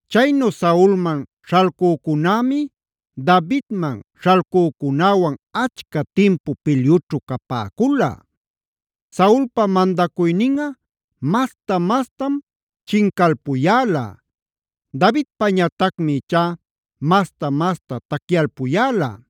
Chaynu Saulman śhalcücunämi Davidman śhalcücunäwan achca timpu pilyućhu capäcula. Saulpa mandacuyninꞌa masta-mastam chincalpuyäla; Davidpañatacmi ichá masta-masta tacyalpuyäla.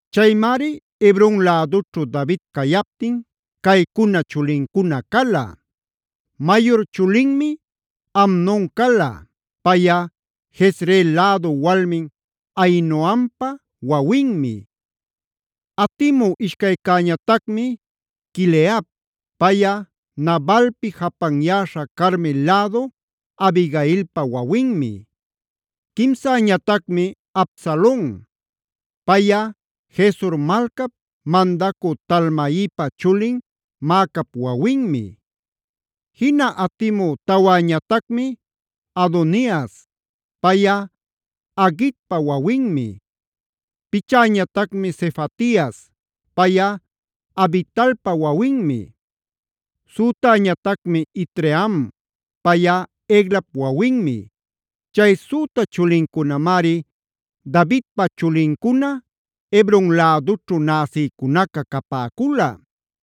Chaymari Hebron lädućhu David cayaptin caycuna chulincuna cala: Mayur chulinmi Amnon cala; payꞌa Jezreel lädu walmin Ahinoampa wawinmi. Atimü ishcaycäñatacmi Quileab; payꞌa Nabalpi japanyäśha Carmel lädu Abigailpa wawinmi. Quimsäñatacmi Absalon; payꞌa Gesur malcap mandacü Talmaipa chulin Maacap wawinmi. Jina atimü tawäñatacmi Adonias; payꞌa Haguitpa wawinmi. Pichäñatacmi Sefatias; payꞌa Abitalpa wawinmi. Sütäñatacmi Itream; payꞌa Eglap wawinmi. Chay süta chulincunamari Davidpa chulincuna Hebron lädućhu näsïcunaca capäcula.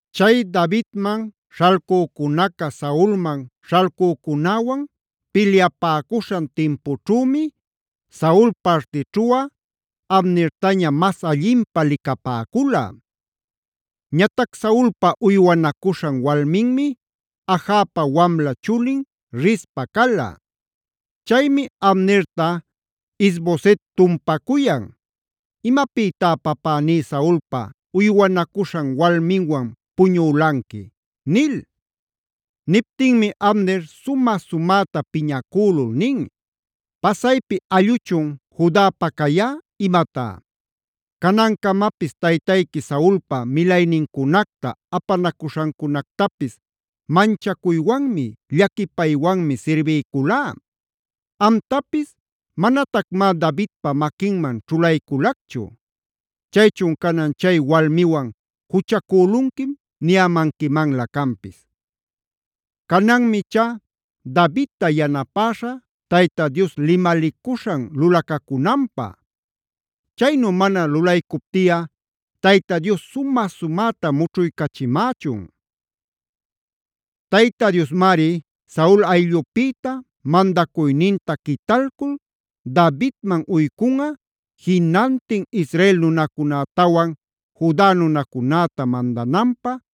Chay Davidman śhalcücunaca Saulman śhalcücunäwan pilyapäcuśhan timpućhümi, Saul partićhuꞌa Abnertaña mas allinpä licapäcula. Ñatac Saulpa uywanacuśhan walminmi Ajapa wamla chulin Rizpa cala. Chaymi Abnerta Is-boset tumpacuyan: “¿¡Imapïtá papäní Saulpa uywanacuśhan walminwan puñülanqui!?” nil. Niptinmi Abner sumä-sumäta piñacülul nin: “¿¡Pasaypi allꞌuchun Judapa cayá imatá!? Canancamapis taytayqui Saulpa milaynincunacta, apanacuśhancunactapis manchacuywanmi, llaquipaywanmi sirbiyculá. Amtapis manatacmá Davidpa maquinman ćhulayculacchu. Chaychun canan chay walmiwan juchacülunquim niyämanquimanlä canpis. Cananmi ichá Davidta yanapäśha Tayta Dios limalicuśhan lulacacunanpä. Chaynu mana lulaycuptiꞌa Tayta Dios sumä-sumäta mućhuycachimächun. Tayta Diosmari Saul ayllupïta mandacuyninta quitalcul Davidman uycunꞌa jinantin Israel nunacunätawan Juda nunacunäta mandananpä,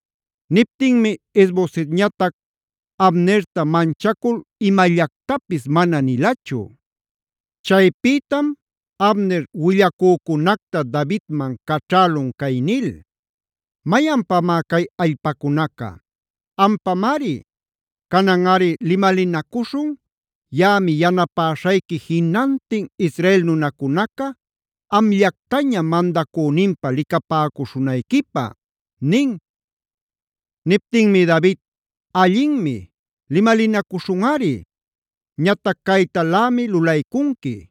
Niptinmi Is-bosetñatac Abnerta manchacul imallactapis mana nilachu. Chaypïtam Abner willacücunacta Davidman caćhälun cay nil: “¿¡Mayanpamá cay allpacunaca!? Ampamari. Cananꞌari limalinacuśhun; yaꞌami yanapäśhayqui jinantin Israel nunacunaca amllactaña mandacüninpä licapäcuśhunayquipä” nin. Niptinmi David: “Allinmi; limalinacuśhunꞌari. Ñatac caytalämi lulaycunqui.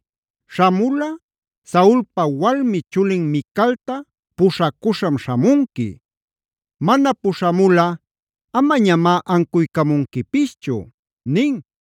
Śhamulꞌa Saulpa walmi chulin Micalta puśhacuśham śhamunqui. Mana puśhamulꞌa amañamá ancuycamunquipischu” nin.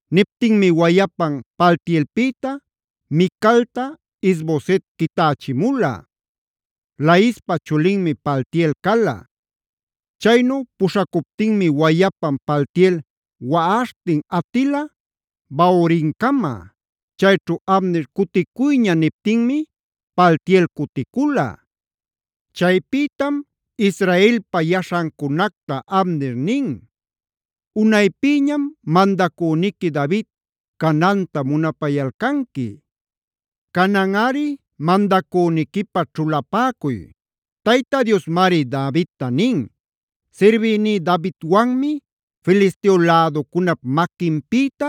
Niptinmi wayapan Paltielpïta Micalta Is-boset quitächimula. Laispa chulinmi Paltiel cala. Chaynu puśhacuptinmi wayapan Paltiel waꞌaśhtin atila Bahurimcama. Chayćhu Abner “Cuticuyña” niptinmi Paltiel cuticula. Chaypïtam Israelpa yaśhancunacta Abner nin: “Unaypïñam mandacüniqui David cananta munapayalcanqui. Cananꞌari mandacüniquipä ćhulapäcuy. Tayta Diosmari Davidta nin: ‘Sirbïní Davidwanmi Filisteo läducunap maquinpïta,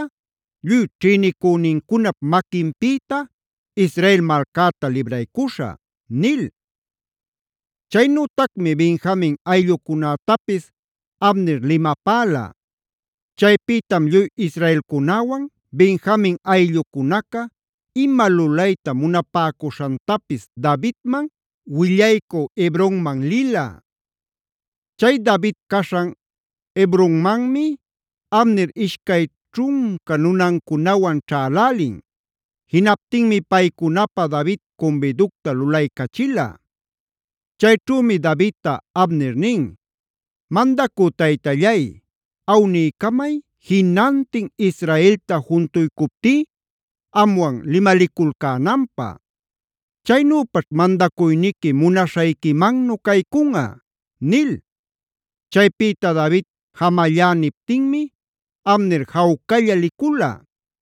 lluy ćhïnicünincunap maquinpïta Israel malcäta libraycuśhä’” nil. Chaynütacmi Benjamin ayllucunätapis Abner limapäla. Chaypïtam lluy israelcunäwan Benjamin ayllucunaca ima lulayta munapäcuśhantapis Davidman willaycü Hebronman lila. Chay David caśhan Hebronmanmi Abner ishcay ćhunca nunancunawan ćhälälin. Jinaptinmi paycunapä David cumbiducta lulaycachila. Chayćhümi Davidta Abner nin: “Mandacü Taytallay, awniycamay jinantin Israelta juntuycuptí amwan limaliculcänanpä. Chaynüpaćh mandacuyniqui munaśhayquimannu caycunꞌa” nil. Chaypïta David “jamallá” niptinmi Abner jawcalla licula.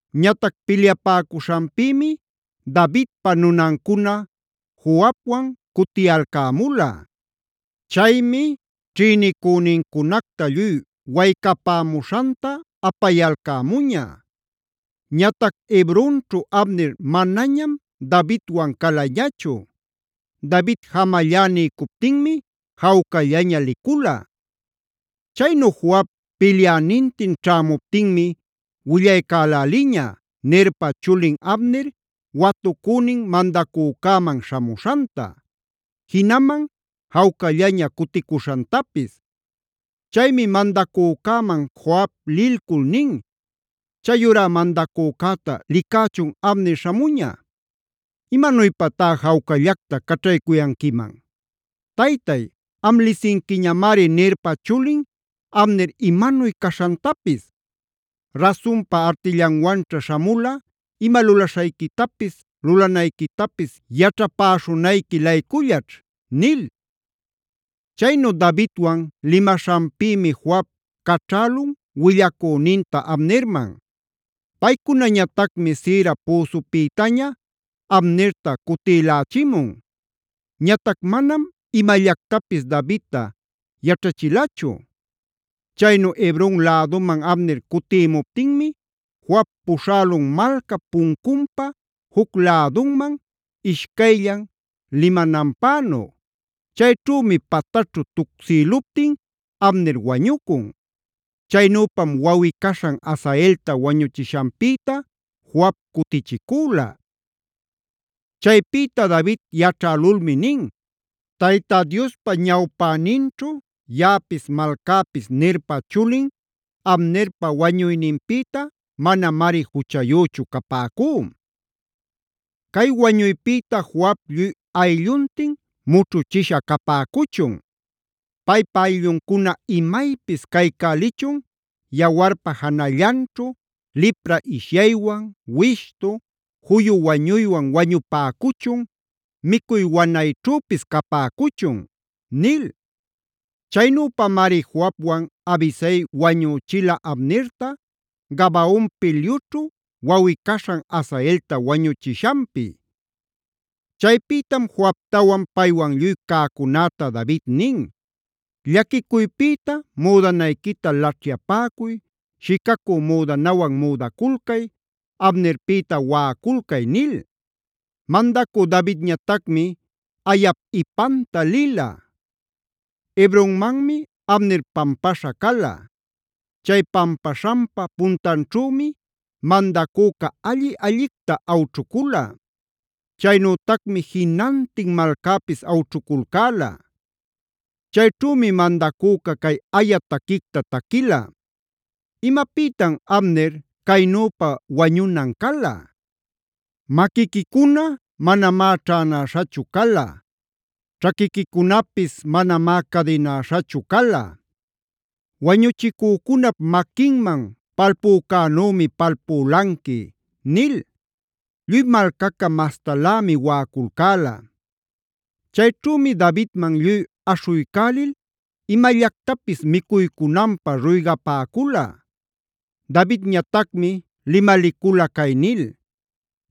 Ñatac pilyapäcuśhanpïmi Davidpa nunancuna Joabwan cutiyalcämula. Chaymi ćhïnicünincunacta lluy waycapämuśhanta apayalcämuña. Ñatac Hebronćhu Abner manañam Davidwan calañachu. David jamallá niycuptinmi jawcallaña licula. Chaynu Joab pilyänintin ćhämuptinmi willaycäläliña Nerpa chulin Abner watucünin mandacücäman śhamuśhanta. Jinaman jawcallaña cuticuśhantapis. Chaymi mandacücäman Joab lilcul nin: “¡Chayurá mandacücäta licächun Abner śhamuña! ¿Imanuypatá jawcallacta caćhaycuyanquiman? ¡Taytay, am lisinquiñamari Nerpa chulin Abner imanuy caśhantapis! Rasunpa artillanwanćha śhamula ima lulaśhayquitapis, lulanayquitapis yaćhapäśhunayqui-laycullaćh” nil. Chaynu Davidwan limaśhanpïmi Joab caćhälun willacüninta Abnerman. Paycunañatacmi Sira püsüpïtaña Abnerta cutïlächimun. Ñatac manam imallactapis Davidta yaćhachilachu. Chaynu Hebron läduman Abner cutïmuptinmi Joab puśhälun malcap puncunpa juc lädunman, ishcayllan limananpänu. Chayćhümi pataćhu tucsïluptin Abner wañucun. Chaynüpam wawꞌi-caśhan Asaelta wañuchishanpïta Joab cutichicüla. Chaypïta David yaćhälulmi nin: “Tayta Diospa ñawpäninćhu yaꞌapis malcäpis Nerpa chulin Abnerpa wañuyninpïta manamari juchayüchu capäcú. Cay wañuypïta Joab lluy aylluntin mućhuchisha capäcuchun. Paypa aylluncuna imaypis caycälichun yawarpa janallanćhu, lipra ishyaywan, wishtu, juyu wañuywan wañupäcuchun, micuy wanayćhüpis capäcuchun” nil. Chaynüpamari Joabwan Abisai wañüchila Abnerta, Gabaon pilyućhu wawꞌi-caśhan Asaelta wañuchishanpi. Chaypïtam Joabtawan paywan lluy cäcunäta David nin: “Llaquicuypïta müdanayquita laćhyapäcuy, shicacü müdanawan müdaculcay, Abnerpïta waꞌaculcay” nil. Mandacü Davidñatacmi ayap ipanta lila. Hebronmanmi Abner pampaśha cala. Chay pampaśhanpa puntanćhümi mandacüca alli-allicta awćhucula. Chaynütacmi jinantin malcäpis awćhuculcäla. Chayćhümi mandacüca cay aya taquicta taquila: “¿Imapïtam Abner caynüpa wañunan cala? ¡Maquiquicuna manamá ćhänäśhachu cala. Ćhaquiquicunapis manamá cadinäśhachu cala! ¡Wañuchicücunap maquinman palpücänümi palpülanqui!” nil. Lluy malcaca mastalämi waꞌaculcäla. Chayćhümi Davidman lluy aśhuycälil imallactapis micuycunanpä ruygapäcula. Davidñatacmi limalicula cay nil: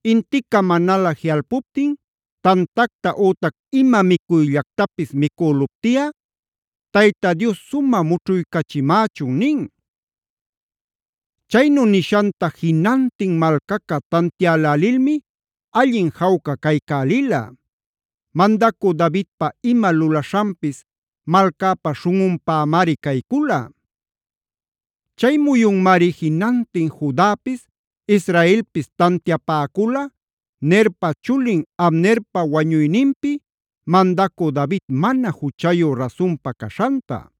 “Intica manalä jiꞌalpuptin tantacta ütac ima micuyllactapis micüluptiꞌa Tayta Dios sumä mućhuycachimächun” nin. Chaynu nishanta jinantin malcaca tantiälälilmi allin jawca caycälila. Mandacü Davidpa ima lulaśhanpis malcäpa śhunꞌunpämari caycula. Chay muyunmari jinantin Judapis, Israelpis tantiapäcula Nerpa chulin Abnerpa wañuyninpi mandacü David mana juchayu rasunpa caśhanta.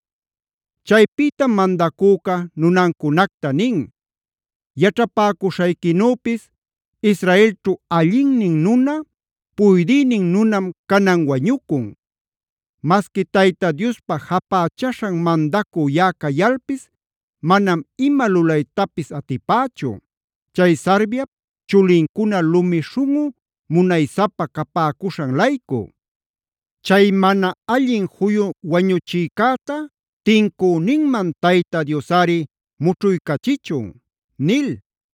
Chaypïtam mandacüca nunancunacta nin: “Yaćhapäcushayquinüpis Israelćhu allinnin nuna, puydïnin nunam canan wañucun. Masqui Tayta Diospa japächaśhan mandacü yaꞌa cayalpis manam ima lulaytapis atipächu, chay Sarviap chulincuna lumi śhunꞌu munaysapa capäcuśhan-laycu. ¡Chay mana allin juyu wañuchïcäta tincüninman Tayta Diosꞌari mućhuycachichun!” nil.